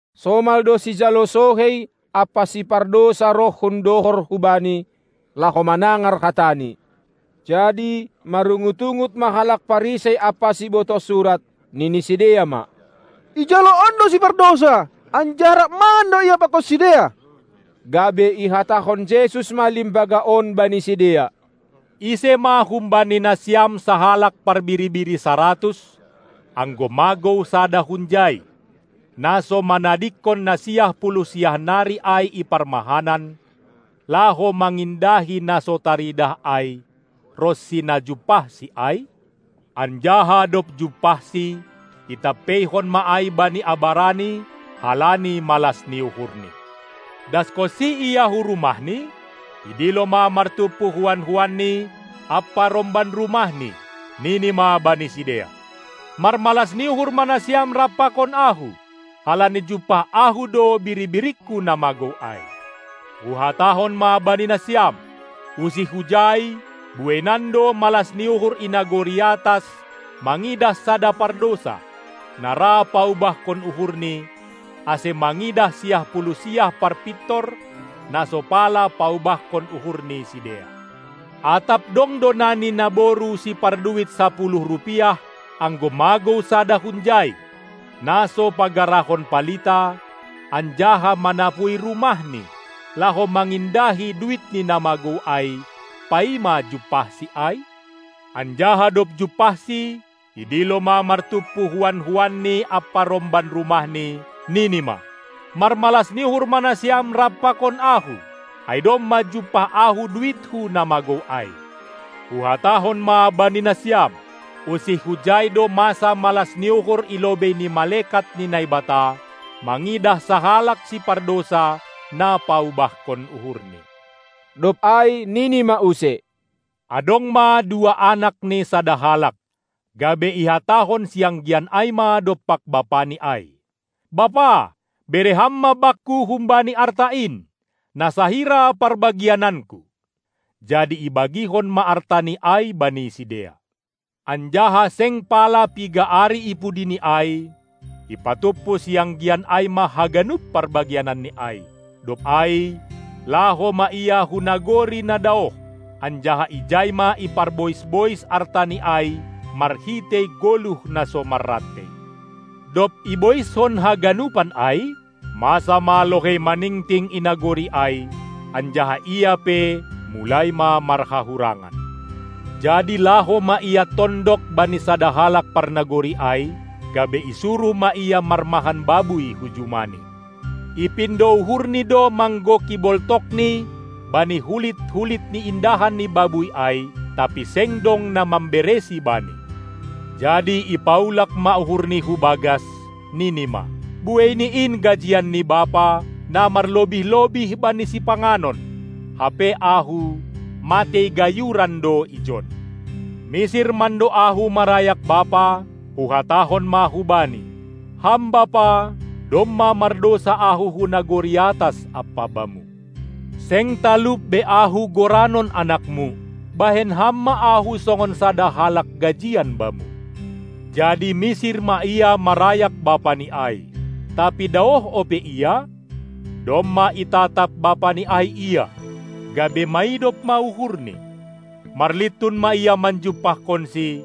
Somal do sijalo sohei ampa sipardousa roh hundohor hu Bani, laho manangar hataNi. Jadi marungut-ungut ma halak Parisei ampa sibotoh surat, nini sidea ma: Ijalo on do sipardousa, anjaha rap mangan do Ia pakon sidea. Gabe ihatahon Jesus ma limbaga on bani sidea: Ise ma humbani nasiam sahalak parbiri-biri saratus, anggo magou sada hunjai, na so manadingkon na siah puluh siah nari ai i parmahanan, laho mangindahi na so taridah ai, ronsi na jumpahsi ai? Anjaha dob jumpahsi, itampeihon ma ai bani abarani halani malas ni uhurni. Daskonsi ia hu rumahni, idilo ma martumpu huan-huanni ampa romban rumahni, nini ma bani sidea: Marmalas ni uhur ma nasiam rap pakon ahu, halani jumpah ahu do biri-biringku na magou ai. Huhatahon ma bani nasiam: Usih hujai, bueinan do malas ni uhur i nagori atas mangidah sada pardousa, na ra paubahkon uhurni, ase mangidah siah puluh siah parpintor, na so pala paubahkon uhur ni sidea. Atap dong do nani naboru siparduit sapuluh rupiah, anggo magou sada hunjai, na so pagarahon palita, anjaha manapui rumahni, laho mangindahi duitni na magou ai, paima jumpahsi ai? Anjaha dob jumpahsi, idilo ma martumpu huan-huanni ampa romban rumahni, nini ma: Marmalas ni uhur ma nasiam rap pakon ahu, ai domma jumpah ahu duitku na magou ai. Huhatahon ma bani nasiam: Usih hujai do masa malas ni uhur i lobei ni malekat ni Naibata mangidah sahalak sipardousa, na paubahkon uhurni. Dob ai nini ma use: Adong ma dua anak ni sada halak. Gabe ihatahon sianggian ai ma dompak bapani ai: Bapa, bere ham ma bakku humbani arta in, na sahira parbagiananku. Jadi ibagihon ma artani ai bani sidea. Anjaha seng pala piga ari ipudi ni ai, ipatumpu sianggian ai ma haganup parbagiananni ai, dob ai laho ma ia hu nagori na daoh, anjaha ijai ma iparbois-bois artani ai marhitei goluh na so marrantei. Dob iboiskon haganupan ai, masa ma lohei maningting i nagori ai, anjaha ia pe mulai ma marhahurangan. Jadi laho ma ia tondok bani sada halak parnagori ai, gabe isuruh ma ia marmahan babuy hu jumani. Ipindo uhurni do manggoki boltokni bani hulit-hulit ni indahan ni babuy ai, tapi seng dong na mamberesi bani. Jadi ipaulak ma uhurni hu bagas, nini ma: Buei ni in gajian ni bapa, na marlobih-lobih bani sipanganon, hape ahu, matei gayuran do ijon. Misir mando ahu marayak bapa, huhatahon ma hubani: Ham bapa, domma mardousa ahu hu nagori atas ampa bamu. Seng talup be ahu goranon anakmu, bahen ham ma ahu songon sada halak gajian bamu. Jadi misir ma ia marayak bapani ai. Tapi daoh ope ia, domma itatap bapani ai ia, gabe maidop ma uhurni; marlintun ma ia manjumpahkonsi,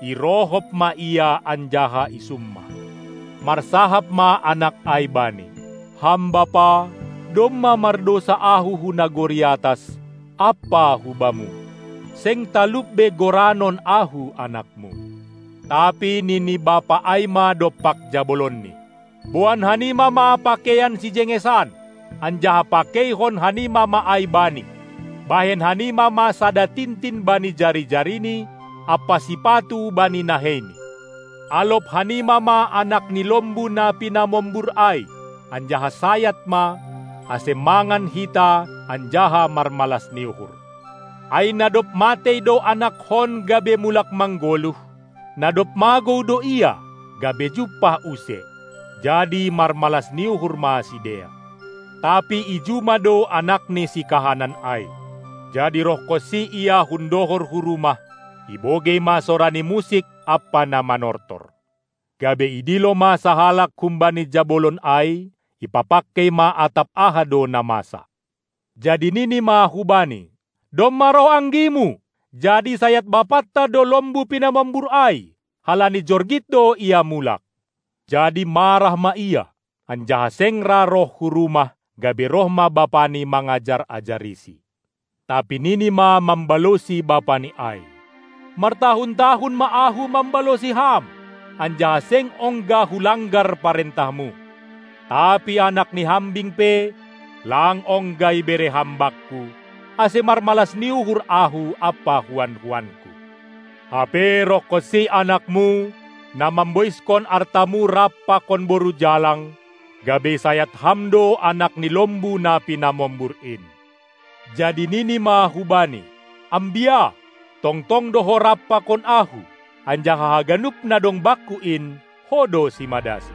irohop ma ia anjaha isummah. Marsahap ma anak ai bani: Ham bapa, domma mardousa ahu hu nagori atas ampa hubamu, seng talup be goranon ahu anakmu! Tapi nini bapa ai ma dompak jabolonni: Boan hanima ma pakeian sijengesan, anjaha pakeihon hanima ma ai bani! Bahen hanima ma sada tintin bani jari-jarini ampa sipatu bani naheini! Alop hanima ma anak ni lombu na pinamombur ai, anjaha sayat ma, ase mangan hita anjaha marmalas ni uhur. Ai na dob matei do anakkon gabe mulak manggoluh, na dob magou do ia, gabe jumpah use. Jadi marmalas ni uhur ma sidea. Tapi i juma do anakni sikahanan ai. Jadi rohkonsi ia hun dohor hu rumah, ibogei ma sora ni musik ampa na manortor. Gabe idilo ma sahalak humbani jabolon ai, ipapangkei ma atap aha do na masa. Jadi nini ma hubani: Domma roh anggimu, jadi isayat bapanta do lombu pinamombur ai, halani jorgit do ia mulak. Jadi marah ma ia, anjaha seng ra roh hu rumah, gabe roh ma bapani mangajar-ajarisi. Tapi nini ma mambalosi bapani ai: Martahun-tahun ma ahu mambalosi ham, anjaha seng ongga hulanggar parentahmu. Tapi anak ni hambing pe lang ongga ibere ham bakku, ase marmalas ni uhur ahu ampa huan-huanku. Hape rohkonsi anakmu, na mamboiskon artamu rap pakon boru jalang, gabe isayat ham do anak ni lombu na pinamombur in. Jadi nini ma hubani: Ambia, tongtong do ho rap pakon ahu, anjaha haganup na dong bakku in, ho do simadasi.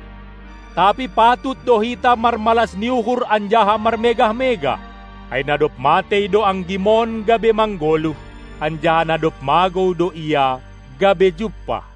Tapi patut do hita marmalas ni uhur anjaha marmegah-megah, ai na dob matei do anggimon gabe manggoluh, anjaha na dob magou do ia, gabe jumpah.